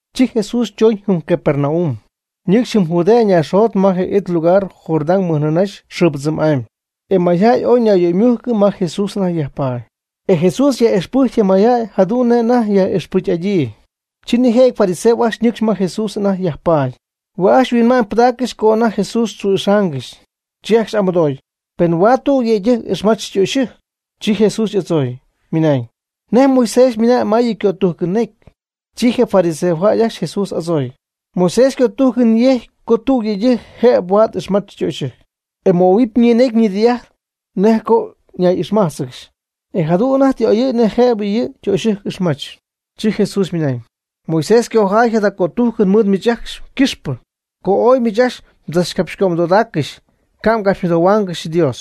Chi Jesús chooñ jɨm Capernaum, nɨcxy jɨm Judea ñaaxjot ma je it lugar Jordán mɨjnɨɨ nïnaxy xɨɨ ypɨdzɨmy'amy. E mayjäy ooy ñayyöymujcɨ ma Jesús anajty yajpaady. E Jesús yaj'ixpɨjcy je mayjäy jadu'n nej anajty yaj'ixpɨcy'adyii. Chi nijëjɨty fariseos ajcxy ñɨcxy ma Jesús anajty yajpaady. Hue' ajcxy yhuinma'ñ pɨdaaccɨxy co anajty Jesús tzu'ixaangɨxy. Chi ajcxy y'amɨdooy, pen huaad tüg yëydɨjc ixmach ytöxyɨjc. Chi Jesús y'adzooy, ymɨnañ: ―¿Nej Moisés ymɨna'ñ ma yɨ' ycötújcɨn ñecy? Chi je fariseos ajcxy Jesús y'adzooy: ―Moisés cötújcɨn yecy co tüg yëydɨjc jëb huaad ixmach ytöxyɨjc, e möhuɨpy ñinecy ñidɨy'ajt co nej ñay'ixmájtzɨgɨxy, e jadu'n anajty tɨ y'oyɨ̈y nej jëb yɨ' ytöxyɨjc ixmach. Chi Jesús ymɨnañ: ―Moisés cojaay jada ycötújcɨn mɨɨd miich ajcxy ycɨxpɨ, co ooy miich ajcxy mdzachcapxycömɨdodaaccɨxy ca' mgapxymɨdohuaangɨxy Dios.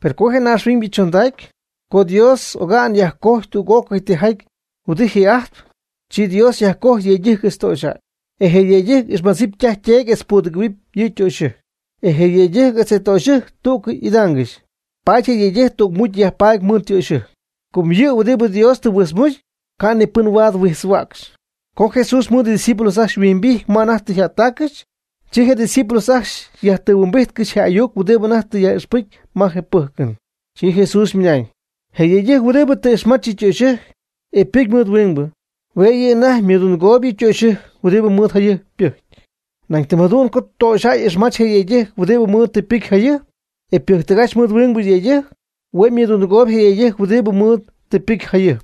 Per co je naaxhuiñybɨ chondacy, co Dios oga'n yajcojy tüg'ócɨy tijaty huɨdi ji'ajtp, chi Dios yajcojy yëydɨjc etz töxyjäy. E je yëydɨjc ixmadzɨpy ytaj yteedy etz pudɨgɨ̈huɨpy yɨ ytöxyɨjc. E je yëydɨjc etz ytöxyɨjc tú'cɨy idaangɨxy. Paady je yëydɨjc tügmucy yajpaady mɨɨd ytöxyɨjc. Com yɨ huɨdibɨ Dios tɨ huijtzmucy, ca' ni pɨn huaad huijtzhuägy. Co Jesús mɨɨd ydiscípulos ajcxy yhuimbijt ma anajty tɨ yjättáccɨxy, chi Jesús ydiscípulos ajcxy yajtɨhuimbijtcɨxy je ayuc huɨdibɨ anajty tɨ yaj'ixpɨcy ma je pɨ́jcɨn. Chi Jesús ymɨnañ: ―Je yëydɨjc huɨdibɨ tɨ ixmach yɨ ytöxyɨjc, e pɨcy mɨɨd huingbɨ, hue' yɨ' anajty ymɨdundɨgooyb yɨ ytöxyɨjc huɨdibɨ mɨɨd jayɨjp ypɨjcy. Nañ tɨm jadu'n co tüg töxyjäy ixmach je yëydɨjc huɨdibɨ mɨɨd tɨ ypɨcy jayɨjp, e ypɨjctɨgach mɨɨd huingbɨ yëydɨjc, hue' ymɨdundɨgooyb je yëydɨjc huɨdibɨ mɨɨd tɨ ypɨcy jayɨjp.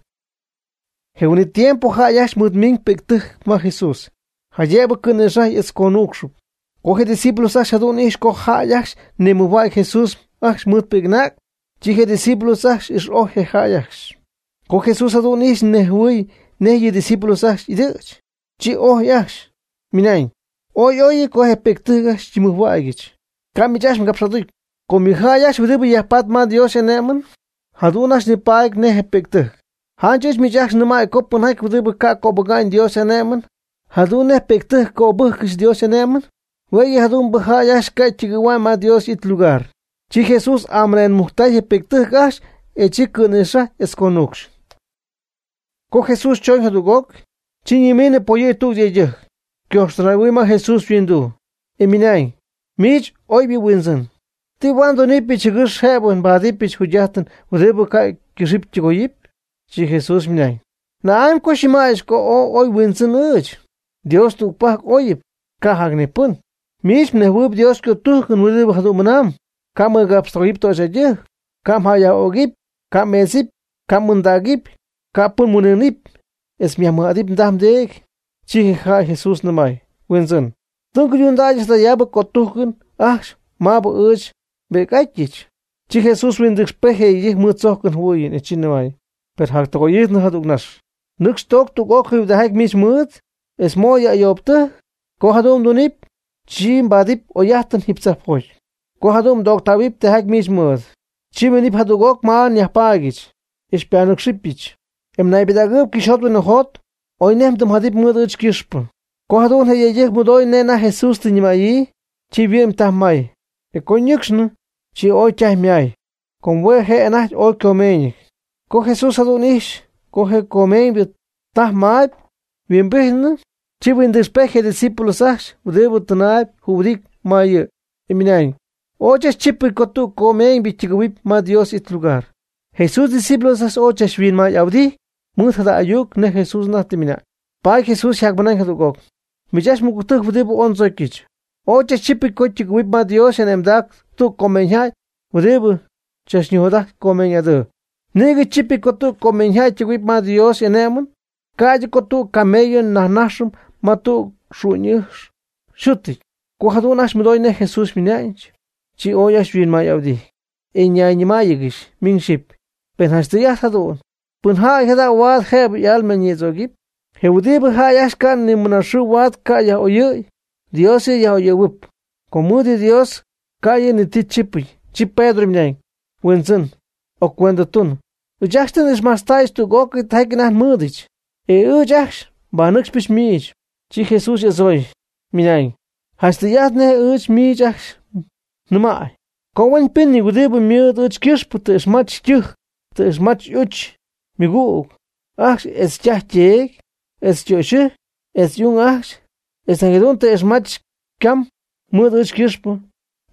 Je huin'it tiempo jäy ajcxy mɨɨd miñ pi'ctɨjc ma Jesús, jaydëb cɨ̈nïxajy etz conuucxɨp. Co Jesús ydiscípulos ajcxy jadu'n ijxy co jäy ajcxy nimɨjhuägy Jesús mɨɨd ajcxy ypi'c'ung, chi je' ydiscípulos ajcxy ix'ojy je jäy ajcxy. Co Jesús jadu'n ijxy nejhuɨɨy nej yɨ' ydiscípulos ajcxy y'ɨdɨ̈ch, chi ojy ajcxy, ymɨnañ: ―Ooy y'óyɨty co je pi'ctɨjc ajcxy xyñimɨjhuägyɨch, ca' miich ajcxy mgapx'aducy. Com yɨ jäy ajcxy huɨdibɨ yajpatp ma Dios y'ané'mɨn, jadu'n ajcxy nipaady nej pi'ctɨjc. Janch ɨɨch miich ajcxy nɨmäy co pɨnjaty huɨdibɨ ca' cöbɨga'ñ Dios y'ané'mɨn, jadu'n nej pi'ctɨjc cöbɨ́jccɨxy Dios y'ané'mɨn, hue' yɨ jadu'mbɨ jäy ajcxy ca' ytɨgɨ̈hua'ñ ma yɨ Dios y'it lugar. Chi Jesús amɨnenmujctay je pi'ctɨjc ajcxy, e chi cɨ̈nïxajɨy etz conuucxcɨxy. Co Jesús chooñ jadüg'oc, chi ñimiinɨ poyɨ̈gy tüg yëydɨjc, ycojxtɨnay'ahuɨy ma Jesús yhuinduu, e ymɨnañ: ―Miich, oybɨ Huindzɨn, ¿ti huaad ndunɨpyɨch jɨgɨx jëbɨ nbadɨpyɨch jugy'ájtɨn huɨdibɨ ca' ycɨxɨpy ytɨgoyɨpy? Chi Jesús ymɨnañ: ―¿Na'amy co xyñɨmäyɨch co oy huindzɨn ɨɨch? Dios tügpajc óyɨp, ca' jac ni pɨn. Miich mnejhuɨɨyb Dios ycötújcɨn huɨdibɨ jadu'n mɨnaam: “Ca' mmɨgapxtɨgoyɨp töxyjäydɨjc; ca' mjäyyaj'ögɨpy; ca' mmeedzɨp; ca' m'ɨɨndaacɨp; ca' pɨn mhuin'ɨɨnɨp; etz myajmɨj'adɨp mdaj mdeedy.” Chi je jäy Jesús nɨmay: ―Huindzɨn, tɨ nguydundäyɨch jadayaab cötújcɨn ajcxy maabɨ ɨɨch nbi'c'atyɨch. Chi Jesús huindɨcxpejty je yëydɨjc mɨɨd tzójcɨn jɨhuɨɨyɨn, e chi nɨmay: ―Per jactɨgoy'ijtnɨ jadügnax. Nɨcx toog tüg'ócɨy huɨdijaty miich mmɨɨd, etz mo' yɨ ayoobtɨjc. Co jadu'n mdunɨpy, chi mbaadɨpy oy'ájtɨn jiiby tzajpjoty. Co jadu'n mdooctähuɨpy tijaty miich mɨɨd, chi minɨp jadüg'oc ma nyajpaadyɨch, e xypanɨ́cxɨbɨch, e mnaybɨdägɨɨb cɨxyjot huinjot oy nej mdɨmyjadɨpy mɨɨd ɨɨch ycɨxpɨ. Co jadu'n je yëydɨjc mɨdoy nej anajty Jesús tɨ ñɨmäyii, chi yhuɨ'my taj may e co ñɨcxnɨ, chi ooy ytajy ymay, com hue' je' anajty ooy ycomeeñɨty. Co Jesús jadu'n ixy co je comeeñybɨ taj may yhuimbijtnɨ, chi huindɨcxpejty je' ydiscípulos ajcxy huɨdibɨ tɨnaayb jühuɨdity ma yɨ', e ymɨnañ: ―Ooy chachtzípɨty co tüg comeeñybɨ ytɨgɨ̈huɨpy ma Dios y'it lugar. Jesús ydiscípulos ajcxy ooy tzachhuinmay'ahuɨdity mɨɨd jada ayuc nej Jesús anajty tɨ ymɨna'ñ. Paady Jesús yjacmɨnañ jadüg'oc: ―Miich ajcxy mɨgügtɨjc huɨdibɨ ooy ndzocyɨch, ooy chachtzípɨty co ytɨgɨ̈huɨp ma Dios y'ane'mdac tüg comeeñyjäy huɨdibɨ tzachnijot'ajt ycomeeñ'adɨɨ. Nïgɨ chípɨty co tüg comeeñ jäy ytɨgɨ̈huɨp ma Dios y'ane'my, ca'ydɨ co tüg camello ñaxɨpy ma tüg xu'ñ'ɨjx yxútɨty. Co jadu'n ajcxy mɨdoy nej Jesús ymɨnañ, chi ooy ajcxy yhuinmay'ahuɨdijty, e nayñɨmáayɨgɨxy miñ xyɨpy: ―Pen janch tɨy'ajt jadu'n, ¿pɨnjäy jada' huaad jëb y'alma ñïdzögɨpy? Je huɨdibɨ jäy ajcxy ca' ni mɨnaxɨɨ huaad ca' yaj'oyɨ̈y, Dios yɨ' yaj'oyɨ̈huɨp, com mɨɨd Dios ca' yɨ' ni ti chípɨty. Chi Pedro ymɨnañ: ―Huindzɨn, occuendtun, ɨɨch ajcxy tɨ n'ixmajtztäyɨch tüg'ócɨy tijaty anajty nmɨɨdɨch, e ɨɨch ajcxy nbanɨcxpɨch miich. Chi Jesús y'adzooy, minañ: ―Janch tɨy'ajt nej ɨɨch miich ajcxy nɨmäy co huenpɨ́nɨty huɨdibɨ mɨɨd ɨɨch ycɨxpɨ tɨ ixmach ytɨjc, tɨ ixmach y'uch ymɨgüg ajcxy etz ytaj yteedy, etz ytöxyɨjc, etz y'ung ajcxy, etz nañ jadu'n tɨ ixmach ycam ɨɨch ycɨxpɨ,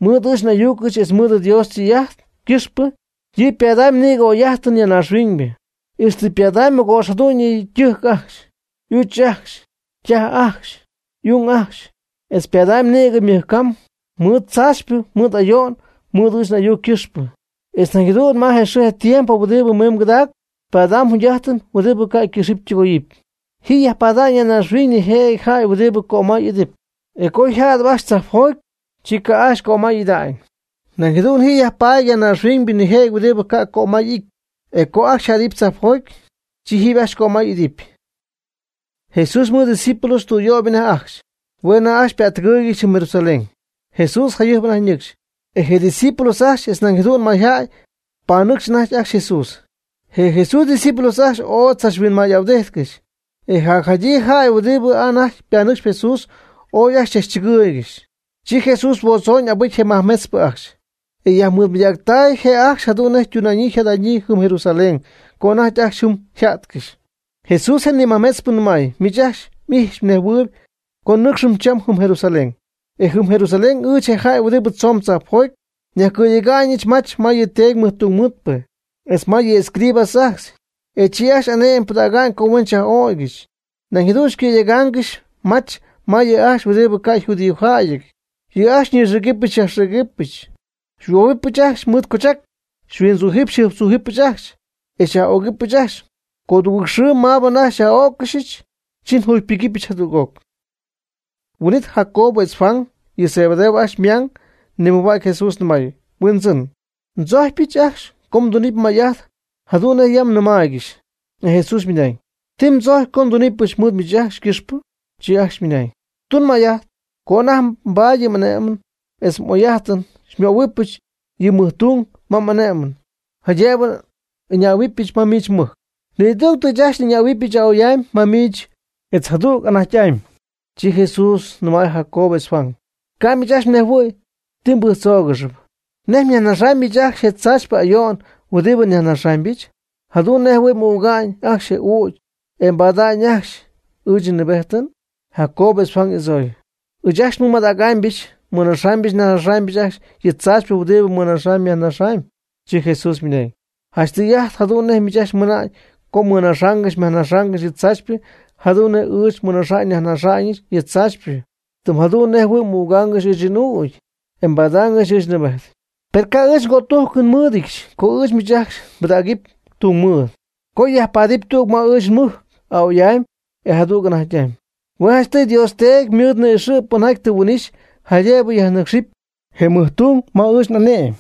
etz ɨɨch n'ayucɨch etz mɨɨd Dios ytɨy'ajt ycɨxpɨ, yɨ' ypadamy nïgɨ oy'ájtɨn ya naaxhuiñ, ixtɨ ypadamy mɨgo'px jadu'ñyɨ ytɨjc ajcxy, y'uch ajcxy, ytaj ajcxy, y'ung ajcxy, etz ypadamy nïgɨ ymɨj cam, mɨɨd tzaachypɨ mɨɨd ayo'n mɨɨd ɨɨch n'ayuc ycɨxpɨ. Etz nañ jadu'n ma je xɨɨ tiempo huɨdibɨ mimb cɨdacpɨ ypadamy jugy'ájtɨn huɨdibɨ ca' ycɨxɨpy ytɨgoyɨpy. Ji yajpaady ya naaxhuiñ nijëjɨty jäy huɨdibɨ cömay ijtp, e co yjäty ajcxy tzajpjoty, chi ca' ajcxy cömay ida'ñ. Nañ jadu'n ji yajpaady ya naaxhuiñ nijëjɨty huɨdibɨ ca' cömay y'ity, e co ajcxy yjädɨpy tzajpjoty, chi jiiby ajcxy cömay y'idɨpy. Jesús mɨɨd ydiscípulos tüyöyp anajty ajcxy, hue' anajty ypättɨgɨɨygɨxy jɨm Jerusalén. Jesús jayɨjp anajty ñɨcxy, e je' ydiscípulos ajcxy etz nañ jadu'n mayjäy panɨcxy anajty ajcxy Jesús. Je Jesús ydiscípulos ajcxy ooy chachhuinmay'ahuɨdíjtcɨxy, e jacjadyii jäy huɨdibɨ anajty ypanɨcxy Jesús ooy ajcxy chɨgɨɨygɨxy. Chi Jesús huodzooñ abɨcy je majmetzpɨ ajcxy, e yajmɨɨdmɨydactay je' ajcxy jadu'n nej ytuna'ñyii yjada'ñyii jɨm Jerusalén co anajty ajcxy jɨm yja'tcɨxy. Jesús je nimajmetzpɨ nɨmay: ―Miich ajcxy m'ijxpy mnejhuɨɨyb co nnɨ́cxɨm cham jɨm Jerusalén. E jɨm Jerusalén, ɨɨch je jäy huɨdibɨ tzoon tzajpjoty, nyajcɨ̈yega'ñɨch mach ma yɨ Teedy mɨjtungmɨɨdpɨ, etz ma yɨ escribas ajcxy. E chi ajcxy ane'mɨn pɨdäga'ñ co huen xyaj'öcɨxɨch. Nañ jadu'n xycɨ̈yegaangɨxɨch mach ma yɨ' ajcxy huɨdibɨ ca' yjudiojäyɨty. Yɨ' ajcxy xyñixïgɨpy xyajxïgɨbyɨch, xyhuobɨpyɨch ajcxy mɨɨd coochac, xyhuindzuj xyjɨjptzújɨbɨch ajcxy, e xyaj'ögɨbɨch ajcxy. Codugɨɨg xɨɨ maabɨ anajty xyaj'öccɨxyɨch, chi njugypɨgɨpyɨch jadüg'oc. Huin'it Jacobo etz Juan, yɨ Zebedeo ajcxy ymang, nimɨjhuägy Jesús, nɨmay: ―Huindzɨn, ndzojcpyɨch ajcxy co mdunɨpy may'ajt jadu'n nej yam nɨmaaygɨxy. E Jesús ymɨnañ: ―¿Ti mdzojcpy co ndunipɨch mɨɨd miich ajcxy ycɨxpɨ? Chi ajcxy ymɨnañ: ―Tun may'ajt co anajty mbaady yɨ m'ané'mɨn etz m'oy'ájtɨn, xymöhuɨbɨch yɨ mɨj tung ma m'ané'mɨn jaydëb n'ɨñähuɨbɨch ma miich mmɨjc. Nidügtɨ ɨɨch ajcxy n'ɨñähuɨpy a'oy'amy ma miich etz jadüg anajty'amy. Chi Jesús nɨmay Jacobo etz Juan: ―Ca' miich ajcxy mnejhuɨ̈y ti tɨ mbɨjctzoogɨxy. ¿Nej myajnaxamyb miich ajcxy je tzaachypɨ ayo'n huɨdibɨ nyajnaxaamybɨch, jadu'n nej jɨhuɨ̈y m'üga'ñ ajcxy ɨɨch n'ügy e mbaada'ñ ajcxy ɨɨch nnɨɨbéjtɨn? Jacobo etz Juan y'adzooy: ―Ɨɨch ajcxy nmɨmadägɨbɨch mɨnaxɨpyɨch nyajnaxɨpyɨch ajcxy yɨ tzaachypɨ huɨdibɨ mmɨnaxamyb myajnaxamyb. Chi Jesús ymɨnañ: ―Janch tɨy'ajt jadu'n nej miich ajcxy mɨna'ñ co mmɨnaxaangɨxy myajnaxaangɨxy yɨ tzaachypɨ jadu'n nej ɨɨch nmɨnaxaamyɨch nyajnaxaamyɨch yɨ tzaachypɨ, tɨm jadu'n nej jɨhuɨ̈y m'ügaangɨxy ɨɨch n'ügy, e mbadaangɨxy ɨɨch nnɨɨbéjtɨn. Per ca' ɨɨch cötújcɨn nmɨ́ɨdɨdyɨch co ɨɨch miich ajcxy nbɨdägɨpy tungmɨɨd, co myajpaadɨp tüg ma ɨɨch nmɨjc a'oy'amy, e jadüg anajty'amy. Hue' janchtɨy Dios Teedy ymɨɨd ni'ixɨ' pɨnjaty tɨ huin'ixy jaydëb yajnɨ́cxɨp je mɨjtung ma ɨɨch n'ané'mɨn.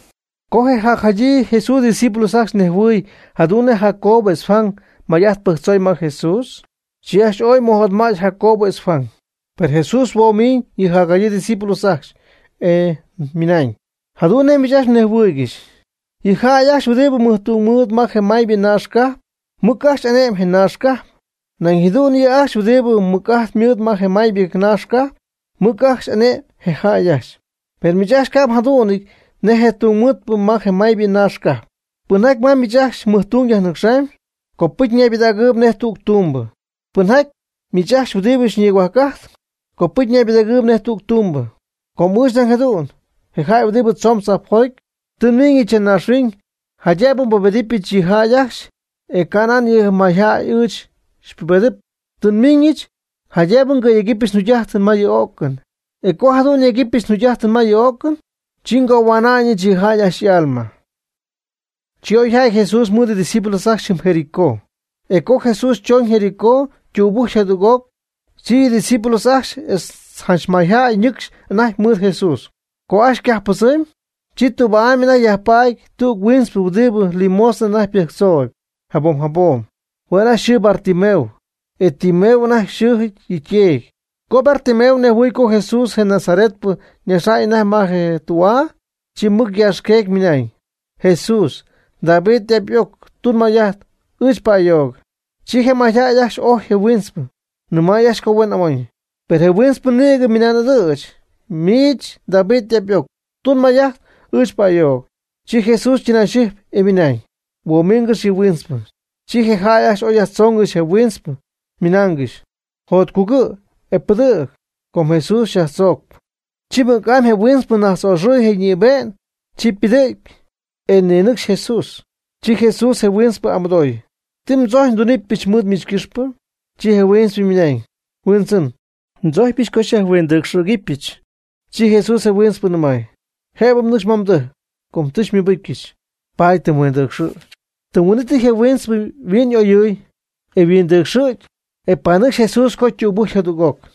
Co je jacjadyii Jesús ydiscípulos ajcxy nejhuɨɨy jadu'n nej Jacobo etz Juan may'ajt pɨjctzoy ma Jesús, chi ajcxy ooy mɨjotmäty Jacobo etz Juan. Per Jesús huomiñ yɨ jacjadyii ydiscípulos ajcxy, e ymɨnañ: ―Jadu'n nej miich ajcxy mnejhuɨɨygɨxy, yɨ jäy ajcxy huɨdibɨ mɨjtungmɨɨd ma je maybɨ naax cajp, mɨc ajcxy ane'my je naax cajp. Nañ jadu'n yɨ' ajcxy huɨdibɨ mɨc'ajt mɨɨd ma je maybɨ naax cajp, mɨc ajcxy ane'my je jäy ajcxy. Per miich ajcxy ca' mjadú'nɨty nej mɨjtungmɨɨdpɨ ma je maybɨ naax cajp. Pɨnjaty ma miich ajcxy mɨjtung yajnɨcxaamb, copɨcy ñaybɨdägɨɨyb nej tüg tumbɨ. Pɨnjaty miich ajcxy huɨdibɨ nigohuajc'ajtp, copɨcy ñaybɨdägɨɨyb nej tüg tumbɨ. Com ɨɨch nañ jadu'n, je jäy huɨdibɨ tzoon tzajpjoty, tɨ nmiiñɨch ya naaxhuiñ jaydëb nbubedɨpyɨch yɨ mayjäy ajcxy, e ca' nan yɨ mayjäy ɨɨch xypubedɨpy. Tɨ nmiiñɨch jaydëb nyegɨpyɨch njugy'ájtɨn ma yɨ o'cɨn. E co jadu'n nyegɨpyɨch njugy'ájtɨn ma yɨ o'cɨn, chi ngohua'na'ñɨch yɨ jäy ajcxy y'alma. Chi oy jäty Jesús mɨɨd ydiscípulos ajcxy jɨm Jericó. E co Jesús tzooñ Jericó ytübɨjcy jadüg'oc, chi yɨ' ydiscípulos ajcxy etz janch mayjäy ñɨ́cxcɨxy anajty mɨɨd Jesús. Co ajcxy ycajp pɨdzɨmy, chi tüba'ay anajty yajpaady tüg huintzpɨ huɨdibɨ limosna anajty ypɨjctzooyb jabom jabom. Hue' anajty yxɨɨ Bartimeo, e Timeo anajty xɨɨjɨty yɨ' yteedy. Co Bartimeo nejhuɨɨy co Jesús je Nazaretpɨ najxp anajty ma je tü'aa, chi mɨc yaaxqueegy ymɨnañ: ―Jesús, David y'ap y'oc, tun may'ajt ɨɨch pa'ayoog. Chi je mayjäy ajcxy ojy je huintzpɨ, nɨmay ajcxy co huen amoñ. Per je huintzpɨ nïgɨ ymɨnan'ɨdɨ̈ch: ―Miich, David y'ap y'oc, tun may'ajt ɨɨch pa'ayoog. Chi Jesús ytɨnayxɨjpy, e ymɨnañ: ―Huomiingɨx yɨ huintzpɨ. Chi je jäy ajcxy oy yajtzoongɨxy je huintzpɨ, nɨmaaygɨxy: ―Jotcugɨ', e pɨdɨ̈g, com Jesús xyaaxtzoob. Chi mɨc'amy je huintzpɨ, najtz'oxɨɨy je ñïbe'ñ, chi ypɨdɨ̈gy, e ninɨcxy Jesús. Chi Jesús je huintzpɨ y'amɨdooy: ―¿Ti mdzojcpy ndunɨpyɨch mɨɨd miich ycɨxpɨ? Chi je huintzpɨ ymɨnañ: ―Huindzɨn, ndzójcpyɨch co xyajhuindɨcxɨ̈gɨbɨch. Chi Jesús je huintzpɨ nɨmay: ―Jëb mnɨcxy ma mdɨjc. Com tɨ xymɨbɨcyɨch, paady tɨ mhuindɨcxɨ̈gy. Tɨm huin'ít je huintzpɨ yhuin'oyɨɨy, e yhuindɨcxɨ̈gy, e panɨcxy Jesús co ytübɨjcy jadüg'oc.